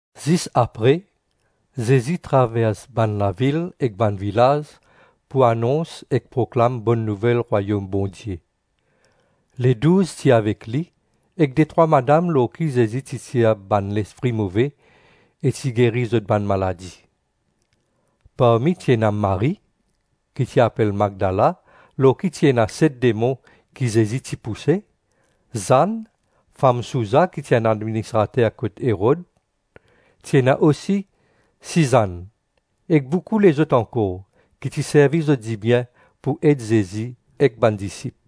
Zis apre, Zezi travers bann lavil ek bann vilaz pou anons ek proklam Bonn Nouvel Rwayom Bondie. Ledouz ti avek li, ek detrwa madam lor ki Zezi ti tir bann lespri move e ti geri zot bann maladi. Parmi ti ena Marie, ki ti apel Magdala lor ki ti ena set demon ki Zezi ti pouse, Zann, fam Souza ki ti enn administrater kot Erod, ti ena osi Sizann, e boukou lezot ankor, ki ti servi zot dibien pou ed Zezi ek bann disip.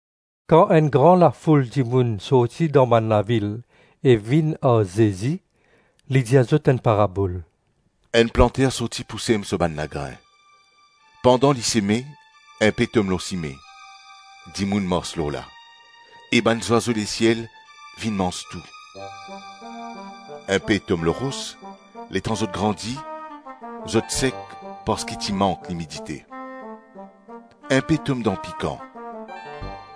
Kan enn gran lafoul dimoun sorti dan bann lavil e vinn ar Zezi, li dir zot enn parabol, “Enn planter sorti pou sem so bann lagrin; pandan li seme, inpe tom lor sime, dimoun mars lor la, e bann zwazo lesiel vinn manz tou. Inpe tom lor ros; letan zot grandi, zot sek parski ti mank limidite. Inpe tom dan pikan,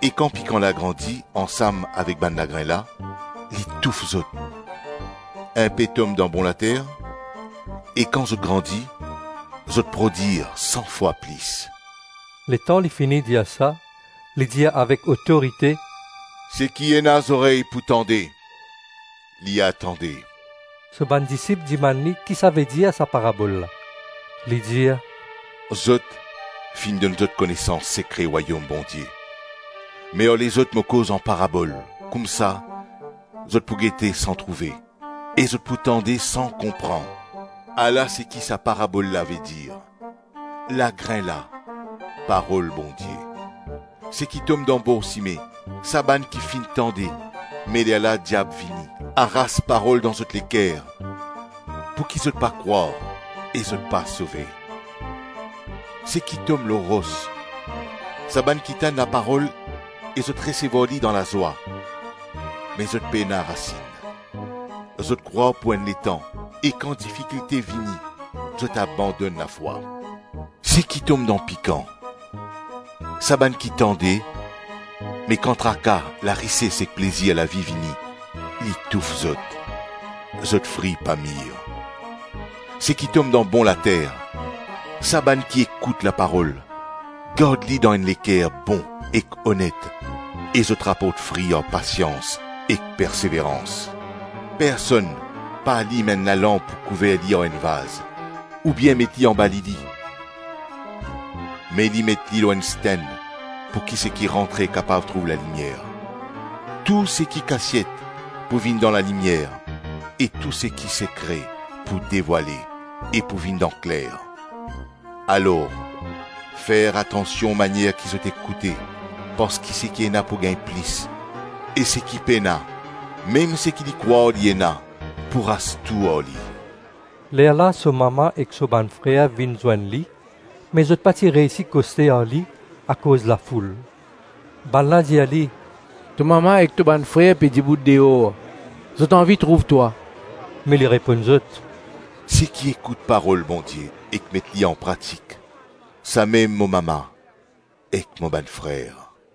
e kan pikan la grandi ansam avek bann lagrin la, li touf zot. Inpe tom dan bon later, e kan zot grandi, zot prodwir san fwa plis.” Letan li fini dir sa, li dir avek otorite, “Seki ena zorey pou tande, li a tande!” So bann disip dimann li ki sa vedir sa parabol la. Li dir, “Zot, finn donn zot konesans sekre Rwayom Bondie; me ar lezot mo koz an parabol, koumsa ‘zot pou gete san trouve, e zot pou tande san konpran.’ “Ala seki sa parabol la vedir: lagrin la, parol Bondie. Seki tom dan bor sime, sa bann ki finn tande me lerla diab vini, aras parol dan zot leker pouki zot pa krwar e zot pa sove. Seki tom lor ros, sa bann ki tann laparol e zot resevwar li dan lazwa; me zot pena rasinn, zot krwar pou enn letan e kan difikilte vini zot abandonn lafwa. Seki tom dan pikan, sa bann ki tande, me kan traka, larises ek plezir lavi vini, li touf zot; zot fri pa mir. Seki tom dan bon later, sa bann ki ekout laparol, gard li dan enn leker bon ek onet, e zot raport fri ar pasians ek perseverans. “Personn pa alim enn lalanp pou kouver li ar enn vaz, oubien met li anba lili, me li met li lor enn stenn, pouki seki rantre kapav trouv lalimier. Tou seki kasiet pou vinn dan lalimier e tou seki sekre pou devwale e pou vinn dan kler. Alor fer atansion manier ki zot ekoute parski seki ena pou gagn plis e seki pena, mem seki li krwar li ena, pou ras tou ar li.” Lerla so mama ek so bann frer vinn zwenn li, me zot pa ti reysi koste ar li akoz lafoul. Bannla dir li, “To mama ek to bann frer pe dibout deor, zot anvi trouv twa.” Me li reponn zot, “Seki ekout Parol Bondie ek met li anpratik samem mo mama ek mo bann frer.”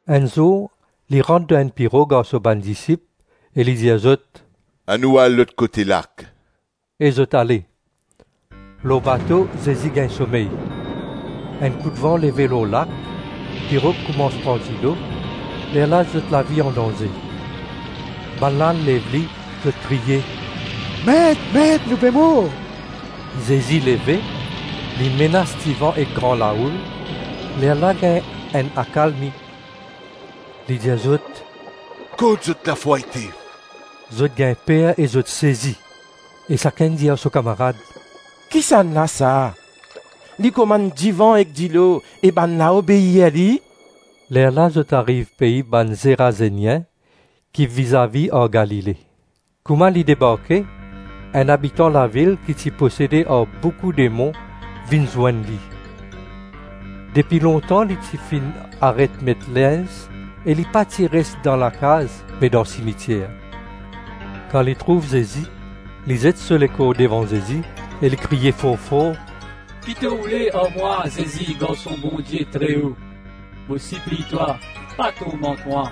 Enn zour li rant dan enn pirog ar so bann disip, e li dir zot, “Anou al lot kote lak.” E zot ale. Lor bato, Zezi gagn somey. Enn koudvan leve lor lak, pirog koumans pran dilo, lerla zot lavi andanze. Bannla al lev li, zot kriye, “Met, Met, nou pe mor!” Zezi leve, li menas divan ek gran laoul, lerla gagn enn akalmi. Li dir zot, “Kot zot lafwa ete?” Zot gagn per e zot sezi, e sakenn dir ar so kamarad, “Kisannla sa, li komann divan ek dilo, e bannla obeir li?” Lerla zot ariv pei bann Zerazenien, ki vizavi ar Galile. Kouma li debarke, enn abitan lavil ki ti posede ar boukou demon vinn zwenn li. Depi lontan li ti finn aret met linz e li pa ti pe res dan lakaz me dan simitier. Kan li trouv Zezi, li zet so lekor devan Zezi e li kriye for-for, “Ki to oule ar mwa, Zezi, Garson Bondie Treo? Mo sipliy twa, pa tourmant mwa.”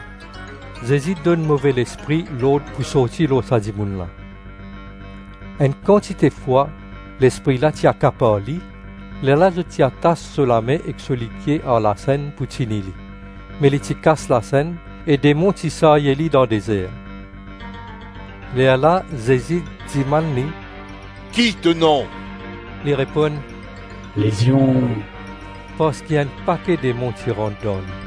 Zezi donn move lespri lord pou sorti lor sa dimoun la. (Enn kantite fwa lespri la ti akapar li; lerla zot ti atas so lame ek so lipie ar lasenn pou tini li, me li ti kas lasenn e demon ti sarye li dan dezer.) Lerla Zezi dimann li, “Ki to nom?” Li reponn, “Lezion,” - parski enn pake demon ti rant dan li.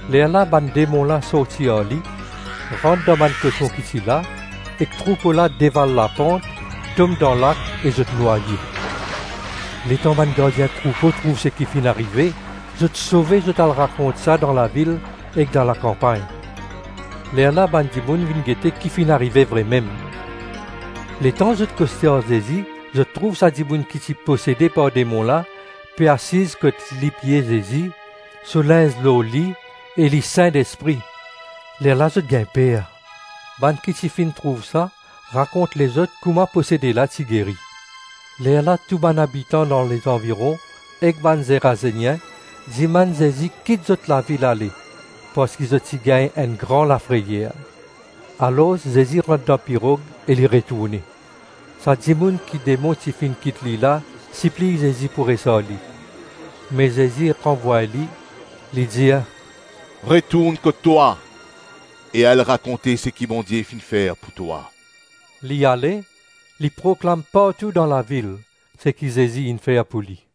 Lerla bann demon la sorti ar li, rant dan bann koson ki ti la, ek troupo la deval lapant, tom dan lak e zot nwaye. Letan bann gardien troupo trouv seki finn arive, zot sove zot al rakont sa dan lavil ek dan lakanpagn. Lerla bann dimoun vinn gete ki finn arive vremem; letan zot koste ar Zezi zot trouv sa dimoun ki ti posede par demon la, pe asiz kot lipie Zezi, so linz lor li e li sindespri. Lerla zot gagn per. Bann ki ti finn trouv sa, rakont lezot kouma posede la ti geri. Lerla tou bann abitan dan lezanviron ek bann Zerazenien dimann Zezi kit zot lavil ale parski zot ti gagn enn gran lafreyer. Alors Zezi rant dan pirog e li retourne. Sa dimoun ki demon ti finn kit li la, sipliy Zezi pou res ar li; me Zezi ranvway li. Li dir, “Retourn kot twa, e al rakonte seki Bondie finn fer pou twa.” Li ale, li proklam partou dan lavil seki Zezi inn fer pou li.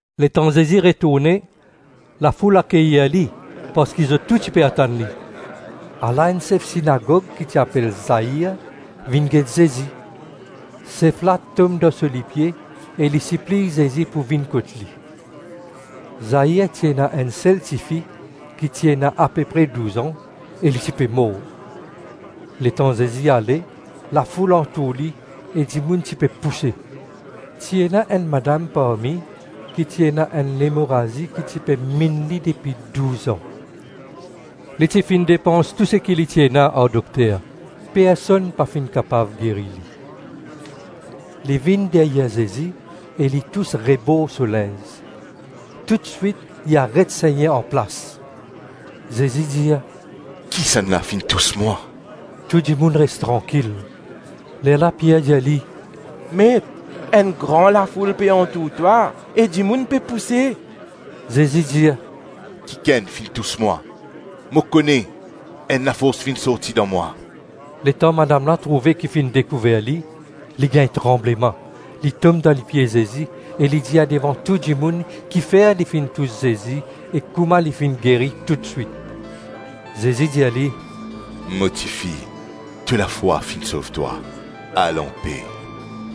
Letan Zezi retourne, lafoul akeyir li parski zot tou ti pe atann li. Ala enn sef sinagog ki ti apel Zair vinn get Zezi. Sef la tom dan so lipie e li sipliy Zezi pou vinn kot li. Zair ti ena enn sel tifi ki ti ena ape pre douz-an, e li ti pe mor. Letan Zezi ale, lafoul antour li e dimoun ti pe pouse. Ti ena enn madam parmi, ki ti ena enn lemorazi ki ti pe minn li depi douz-an. Li ti finn depans tou seki li ti ena ar dokter. Personn pa finn kapav geri li. Li vinn deryer Zezi e li tous rebor so linz. Toutswit li aret segne anplas. Zezi dir, “Kisannla finn tous mwa?” Tou dimoun res trankil, lerla Pier dir li, “Met, enn gro lafoul pe antour twa e dimoun pe pouse.” Zezi dir, “Kikenn finn tous mwa. Mo kone enn lafors finn sorti dan mwa.” Letan madam la trouve ki finn dekouver li, li gagn tranbleman, li tom dan lipie Zezi e li dir devan tou dimoun kifer li ti finn tous Zezi e kouma li finn geri toutswit. Zezi dir li, “Mo tifi, to lafwa finn sov twa; al anpe.”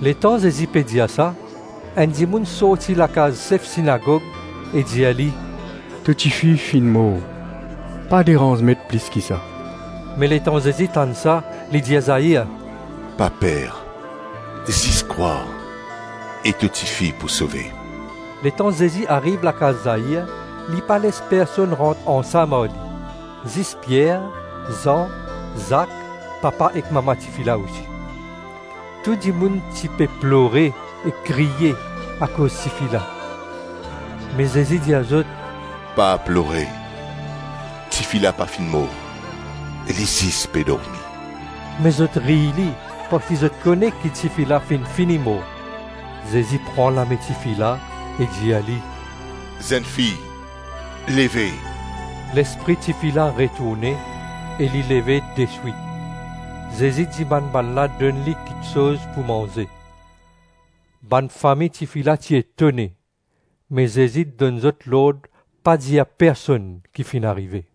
Letan Zezi pe dir sa, enn dimoun sorti lakaz sef sinagog e dir li, “To tifi finn mor, pa deranz Met plis ki sa.” Me letan Zezi tann sa, li dir Zair, “Pa per, zis krwar e to tifi pou sove.” Letan Zezi ariv lakaz Zair, li pa les personn rant ansam ar li, zis Pier, Zan, Zak, papa ek mama tifi la osi. Tou dimoun ti pe plore, e kriye, akoz tifi la. Me Zezi dir zot, “Pa plore. Tifi la pa finn mor, li zis pe dormi.” Me zot riy li, parski zot kone ki tifi la finn fini mor. Zezi pran lame tifi la e dir li, “Zennfi, leve!” Lespri tifi la retourne, e li leve deswit. Zezi dimann bannla donn li kiksoz pou manze. Bann fami tifi la ti etone; me Zezi donn zot lord pa dir personn ki finn arive.